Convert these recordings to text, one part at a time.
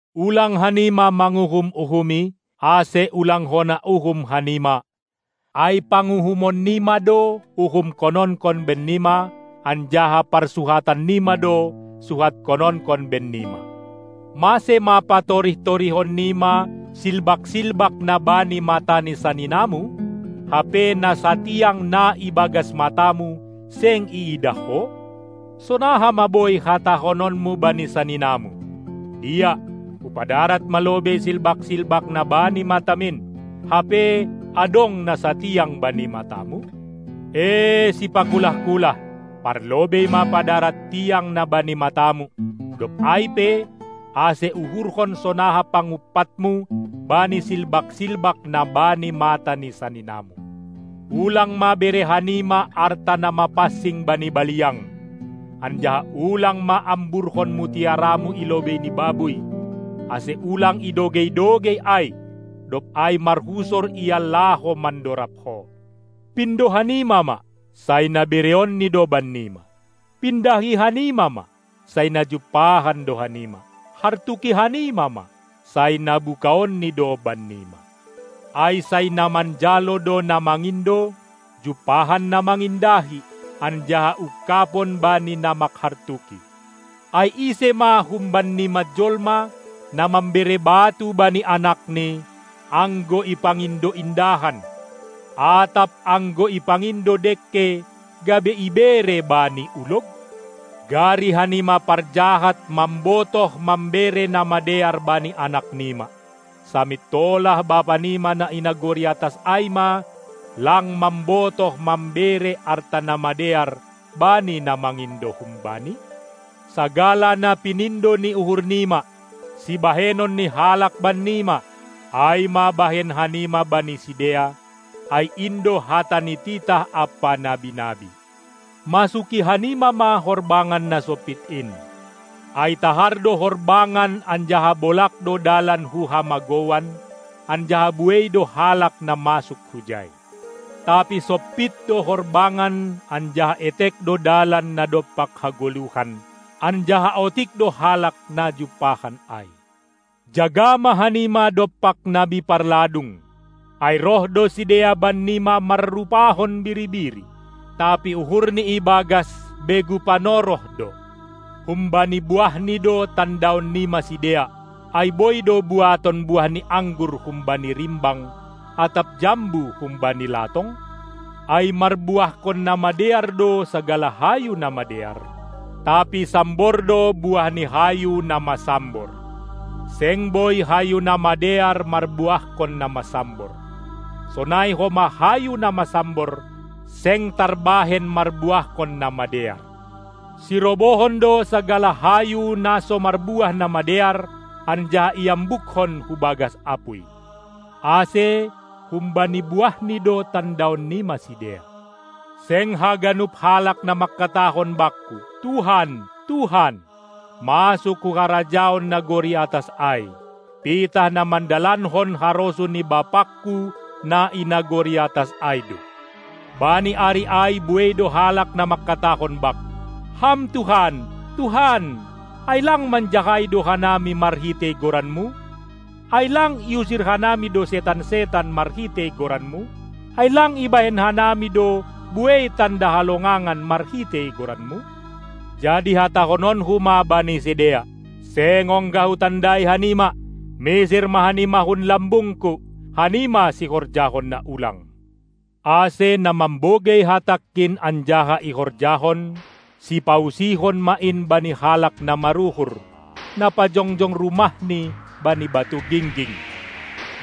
Ulang hanima manguhum-uhumi, ase ulang hona uhum hanima, ai panguhumonnima do uhumhononkon bennima, anjaha parsuhatannima do suhathononkon bennima. Mase ma patorih-torihonnima silbak-silbak na bani mata ni saninamu, hape na satiang na ibagas matamu seng iidah ho? Sonaha ma boi hatahononmu bani saninamu: Dia, hupadarat ma lobei silbak-silbak na bani matamin, hape adong na satiang bani matamu? Ee sipakulah-kulah! Parlobei ma padarat tiang na bani matamu, dob ai pe, ase uhurhon sonaha pangumpatmu bani silbak-silbak na bani mata ni saninamu. Ulang ma bere hanima arta na mapansing bani baliang, anjaha ulang ma amburhon mutiaramu i lobei ni babuy, ase ulang idogei-dogei ai, dob ai marhusor ia laho mandorab ho. Pindo hanima ma, sai na bereonNi do bannima, pindahi hanima ma, sai na jumpahan do hanima, hartuki hanima ma, sai na bukaonNi do bannima. Ai sai na manjalo do na mangindo, jumpahan na mangindahi, anjaha ungkabon bani na mangkartuki. Ai ise ma humbannima jolma, na mambere batu bani anakni, anggo ipangindo indahan, atap anggo ipangindo dengke, gabe ibere bani ulog? Gari hanima parjahat mambotoh mambere na madear bani anaknima, samintolah Bapanima na i nagori atas ai ma lang mambotoh mambere arta na madear bani na mangindo hum-Bani? Sagala na pinindo ni uhurnima, sibahenon ni halak bannima, ai ma bahen hanima bani sidea, ai in do hata ni titah ampa nabi-nabi. Masuki hanima ma horbangan na sompit in, ai tahar do horbangan anjaha bolag do dalan hu hamagouan, anjaha buei do halak na masuk hujai. Tapi sompit do horbangan anjaha etek do dalan na dompak hagoluhan, anjaha otik do halak na jumpahan ai. Jaga ma hanima dompak nabi parladung, ai roh do sidea bannima marrupahon biri-biri, tapi uhurni ibagas begu panoroh do. Humbani buahni do tandaonnima sidea. Ai boi do buaton buah ni anggur humbani rimbang atap jambu humbani latong? Ai marbuahkon na madear do sagala hayu na madear, tapi sambor do buah ni hayu na masambor. Seng boi hayu na madear marbuahkon na masambor; sonai homa hayu na masambor seng tarbahen marbuahkon na madear. Sirobohon do sagala hayu na so marbuah na madear, anjaha iambukkon hu bagas apuy. Ase humbani buahni do tandaonnima sidea. Seng haganup halak na mangkatahon Bakku "Tuhan, Tuhan!" masuk hu harajaon nagori atas ai, pitah na mandalankon harosuh ni BapangKu na i nagori atas ai do. Bani ari ai buei do halak na mangkatahon Bakku: Ham Tuhan, Tuhan, ai lang manjahai do hanami marhitei goranMu? Ai lang iusir hanami do setan-setan marhitei goranMu? Ai lang ibahen hanami do buei tanda halongangan marhitei goranMu? Jadi hatahononKu ma bani sidea: Seng ongga Hutandai hanima, misir ma hanima hun lambungKu, hanima sihorjahon na ulang. Ase na mambogei hatangKin anjaha ihorjahon, sipausihon ma in bani halak na maruhur, na pajongjong rumahni bani batu gingging.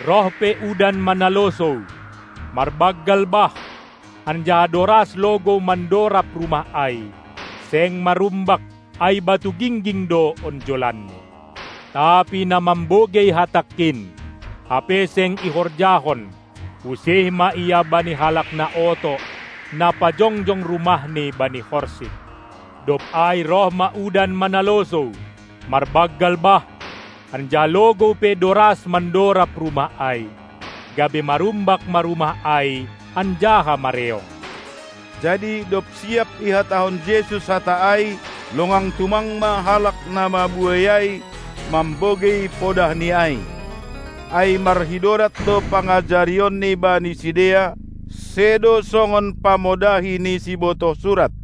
Roh pe udan manalosou, marbanggal bah, anjaha doras logou mandorab rumah ai, seng marumbak, ai batu gingging do onjolanni. Tapi na mambogei hatangKin, hape seng ihorjahon, usih ma ia bani halak na oto, na pajongjong rumahni bani horsik. Dob ai roh ma udan manalosou, marbanggal bah, anjaha logou pe doras mandorab rumah ai, gabe marumbak ma rumah ai anjaha mareong. Jadi dob siap ihatahon Jesus hata ai, longang tumang ma halak na mabuei ai mambogei podahni ai. Ai marhidorat do pangajarionNi bani sidea, sedo songon pamodahi ni sibotoh surat.